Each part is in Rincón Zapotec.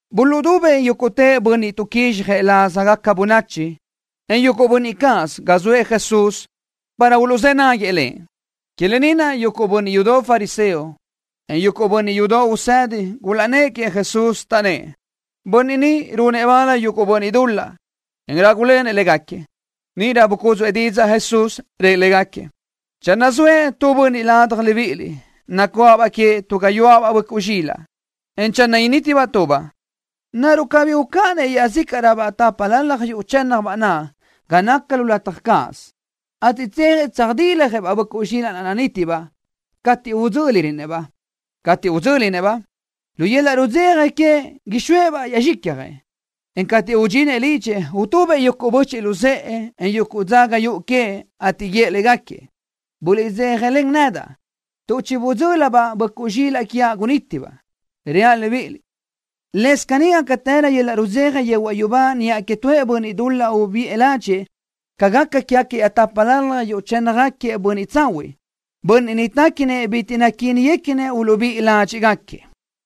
Buluʼdubëʼ yúguʼtë bönniʼ tuʼquízxjëʼ lázagaca bönachi, en yuguʼ bönniʼ cáʼasö ga zoëʼ Jesús para uluʼzë́ náguiëʼ Lëʼ. Que lë ni naʼ yuguʼ bönniʼ yudoʼ fariseo, en yuguʼ bönniʼ yudoʼ usedi gulaʼnnë́ʼ queëʼ Jesús, taʼnnë́ʼ: —Bönniʼ ni runëʼ bal yuguʼ bönniʼ dul-laʼ, en rágulenëʼ légaquiëʼ. Níʼirö bucúdzuʼë didzaʼ Jesús, rëʼ légaquiëʼ: —Channö zoëʼ tu bönniʼ ladaj libíʼiliʼ, nacuáʼabaʼ queëʼ tu gayuáʼabaʼ böʼcuʼ zxilaʼ, en channö nítibaʼ tubaʼ, ¿naruʼ cabí ucáʼanëʼ iaʼzícaʼröbaʼ tápalalaj yuʼ chë́nnabaʼ naʼ ga naca lu lataj cáʼasö, ateʼ tsejëʼ tsöjdiljëʼ-baʼ böʼcuʼ zxilaʼ naʼ nanítibaʼ, cateʼ udzö́lirönëʼ-baʼ? Cateʼ udzö́linëʼ-baʼ, lu yöl-laʼ rudzeja queëʼ ixóëʼ-baʼ yaʼ zxicjëʼ, en cateʼ udxinëʼ lidxëʼ utubëʼ yuguʼ böchiʼ luzë́ʼë, en yuguʼ dzaga yuʼu queëʼ, ateʼ guíëʼ légaquiëʼ: “Buliʼdzéjalen nedaʼ, tuʼ chibudzö́lidaʼ-baʼ böʼcuʼ zxilaʼ quiaʼ gunítibaʼ.” Reaʼ libíʼiliʼ: Lëscaʼ caní gácatërö yöl-laʼ rudzeja yehuaʼ yubá niʼa queëʼ tuëʼ bönniʼ dul-laʼ ubíʼi ládxëʼë ca gaca quégaquiëʼ tápalalaj yuʼ chënnëʼ bönniʼ tsahuiʼ, bönniʼ téquinëʼ bitiʼ naquíniguequinëʼ uluʼbíʼi ládxiʼgaquiëʼ.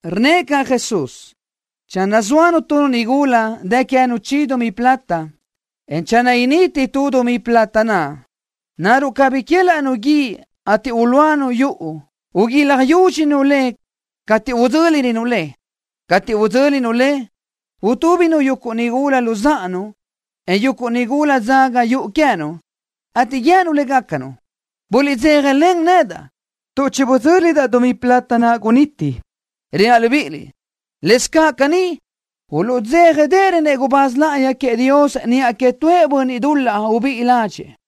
Rnnëʼ caʼ Jesús: —Channö zóanu tu nigula, dë queë́nu chi dumí plata, en channö initi tu dumí plata naʼ, ¿naruʼ cabí uquélaʼnu guíʼ, ateʼ ulúanu yuʼu, uguilaj yúdxinu le cateʼ udzö́lirönu le? Cateʼ udzö́linu le, utúbinu yuguʼ nigula luzáʼanu, en yuguʼ nigula dzaga yuʼu queë́nu, ateʼ guië́nu légacanu: “Buliʼdzéjalen nedaʼ, tuʼ chibudzö́lidaʼ dumí plata naʼ guniti.” Reaʼ libíʼiliʼ: Lëscaʼ caní, uluʼdzéjadeʼerönëʼ gubáz láʼayi queëʼ Dios niʼa queëʼ tuëʼ bönniʼ dul-laʼ ubíʼi ládxëʼë.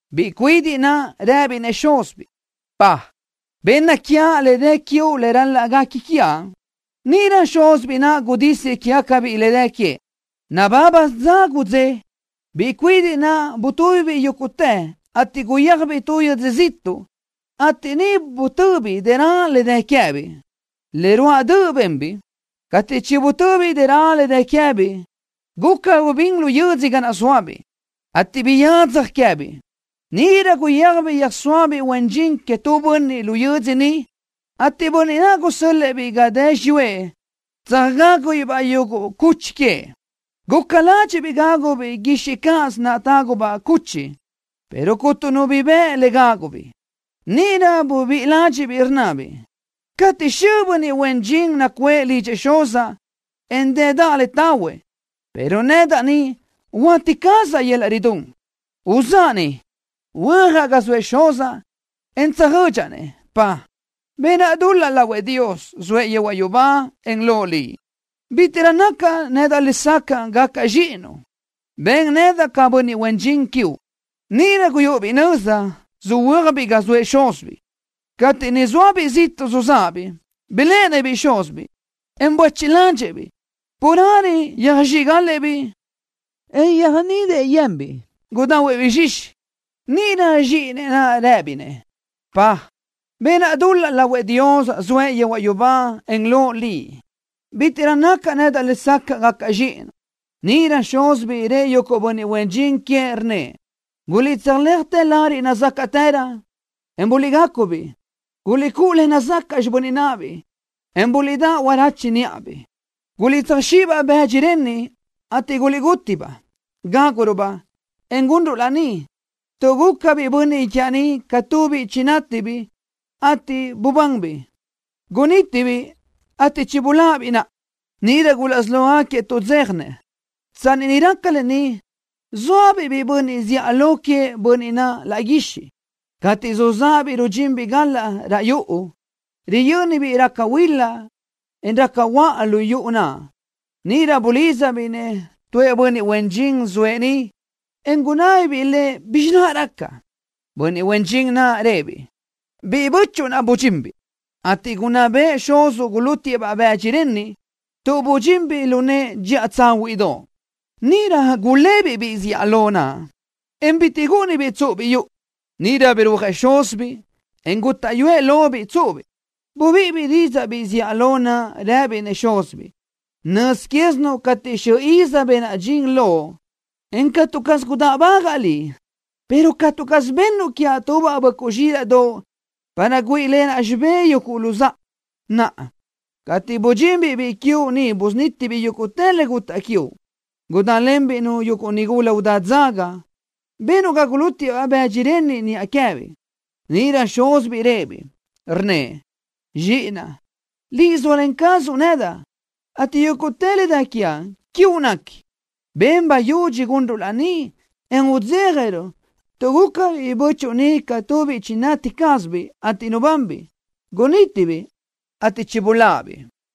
Biʼi cuidiʼ naʼ rëbiʼ-nëʼ xúzibiʼ: “Dad, benna quiaʼ le dë quiuʼ le ral-laʼ guequi quiaʼ.” Níʼirö xúzibiʼ naʼ gudísiëʼ quégacabiʼ le dë queëʼ. Nabábasö dza gudzé, biʼi cuidiʼ naʼ butúbibiʼ yúguʼtë, ateʼ guyéajbiʼ tu yödzö ziʼtuʼ, ateʼ niʼ butöbiʼ dërö le dë queë́biʼ. Le ruáʼ döʼ benbiʼ. Cateʼ chibutöbiʼ dërö le dë queë́biʼ, guca gubín lu yödzö ga naʼ zóabiʼ, ateʼ biyadzaj queë́biʼ. Níʼirö guyéajbiʼ yöjsóabiʼ huen dxin queëʼ tu bönniʼ lu yödzö niʼ, ateʼ bönniʼ naʼ gusö́l-lëʼë-biʼ ga dë xiyúëʼ tsöjgágubiʼ-baʼ yuguʼ cuchi queëʼ. Guca ládxiʼbiʼ gágubiʼ guixiʼ cáʼasö naʼ tágubaʼ cuchi, pero cuntu nu bi bëʼ le gágubiʼ. Níʼirö bubíʼi ládxiʼbiʼ, rnnabiʼ: “Cateʼ xö bönniʼ huen dxin nacuʼë lidxëʼ xuzaʼ, en dëdaʼ le tahuëʼ, pero nedaʼ ni huáti cazaʼ yöl-laʼ ridún. Uzáʼa ni, huöjaʼ ga zoëʼ xuzaʼ, en tsöjödxaʼ-nëʼ: Dad, benaʼ dul-laʼ lahuëʼ Dios, zoëʼ yehuaʼ yubá, en loʼ liʼ. Bítiʼrö nacaʼ nedaʼ lesacaʼ gacaʼ zxíʼinuʼ. Ben nedaʼ ca bönniʼ huen dxin quiuʼ.” Níʼirö guyúʼubiʼ nöza, söhuö́ajbiʼ ga zoëʼ xúzibiʼ. ’Cateʼ niʼ zóabiʼ ziʼtuʼ suzáʼabiʼ, biléʼenëʼ-biʼ xúzibiʼ, en buéchiʼ ládxëʼë-biʼ. Carelö yöjzxíʼgalëʼ-biʼ xúzibiʼ, en yöjnidëʼ yenbiʼ, gudahuëʼ-biʼ zxixi. Níʼirö zxíʼinëʼ naʼ rëbiʼ-nëʼ: “Dad, benaʼ dul-laʼ lahuëʼ Dios, zoëʼ yehuaʼ yubá, en loʼ liʼ. Bítiʼrö nacaʼ nedaʼ lesacaʼ gacaʼ zxíʼinuʼ.” Níʼirö xúzibiʼ rëʼ yuguʼ bönniʼ huen dxin queëʼ, rnnëʼ: “Guliʼtsöjléajtë lariʼ nazácaʼtërö, en guliʼgacu-biʼ. Guliʼcúʼu le nazacaʼ xibö́n náʼabiʼ, en buliʼdáʼ huarache níʼabiʼ. Guliʼtsöjzxíʼi-baʼ bëdxi renniʼ, ateʼ guliʼguti-baʼ. Gáguruʼ-baʼ, en gunruʼ laní, tuʼ guca biʼi bönniʼ quiaʼ ni ca tu biʼi chinátibiʼ, ateʼ bubanbiʼ. Gunítibiʼ, ateʼ chibuláʼabiʼ naʼa.” Níʼirö gulaʼsí lógaquiëʼ tuʼdzéjanëʼ. ’Tsanni niʼ raca lë ni, zóabiʼ biʼi bönniʼ zíʼalö queëʼ bönniʼ naʼ laʼ guixiʼ. Cateʼ suzáʼabiʼ rudxinbiʼ galaʼ raʼ yuʼu, riyö́nibiʼ raca huila, en raca huöʼa lu yuʼu naʼ. Níʼirö bulídzabiʼ-nëʼ tuëʼ bönniʼ huen dxin zoëʼ niʼ, en gunábibiʼ lëʼ bizxi naʼ raca. Bönniʼ huen dxin naʼ rëʼë-biʼ: “Biʼi bö́chuʼu naʼ budxinbiʼ, ateʼ gunná bëʼë xuzuʼ gulútiëʼ-baʼ bëdxi renniʼ, tuʼ budxinbiʼ lu nëʼë dxiʼa tsáhuiʼdoʼ.” Níʼirö gulébiʼ biʼi zíʼalö naʼ, en bitiʼ gúʼunibiʼ tsúʼubiʼ yuʼu. Níʼirö birúajëʼ xúzibiʼ, en gútaʼyuëʼ lobiʼ tsúʼubiʼ. Bubíʼibiʼ didzaʼ biʼi zíʼalö naʼ, rëbiʼ-nëʼ xúzibiʼ: “Nöz quézinuʼ cateʼ xö iz benaʼ dxin loʼ, en catu caz gudáʼbagaʼa liʼ, pero catu caz bennuʼ quiaʼ tubaʼ böʼcuʼ zxílaʼdoʼ para güíʼilenaʼ xibé yuguʼ luzáʼa. Naʼa, cateʼ budxinbiʼ biʼi quiuʼ ni busunítibiʼ yuguʼ le gutaʼ quiuʼ, gudálenbiʼ-nu yuguʼ nigula udá dzaga, benuʼ ga gulútiëʼ-baʼ bëdxi renniʼ niʼa queë́biʼ.” Níʼirö xúzibiʼ rëʼë-biʼ, rnnëʼ: “Zxíʼinaʼ, liʼ zóalen cazuʼ nedaʼ ateʼ yúguʼtë le dë quiaʼ, quiuʼ nequi. Ben bayudxi gunruʼ laní, en udzéjaruʼ, tuʼ gúcabiʼ biʼi bö́chuʼu ni ca tu biʼi chinati cázabiʼ, ateʼ nubanbiʼ. Gunítibiʼ ateʼ chibuláʼabiʼ.”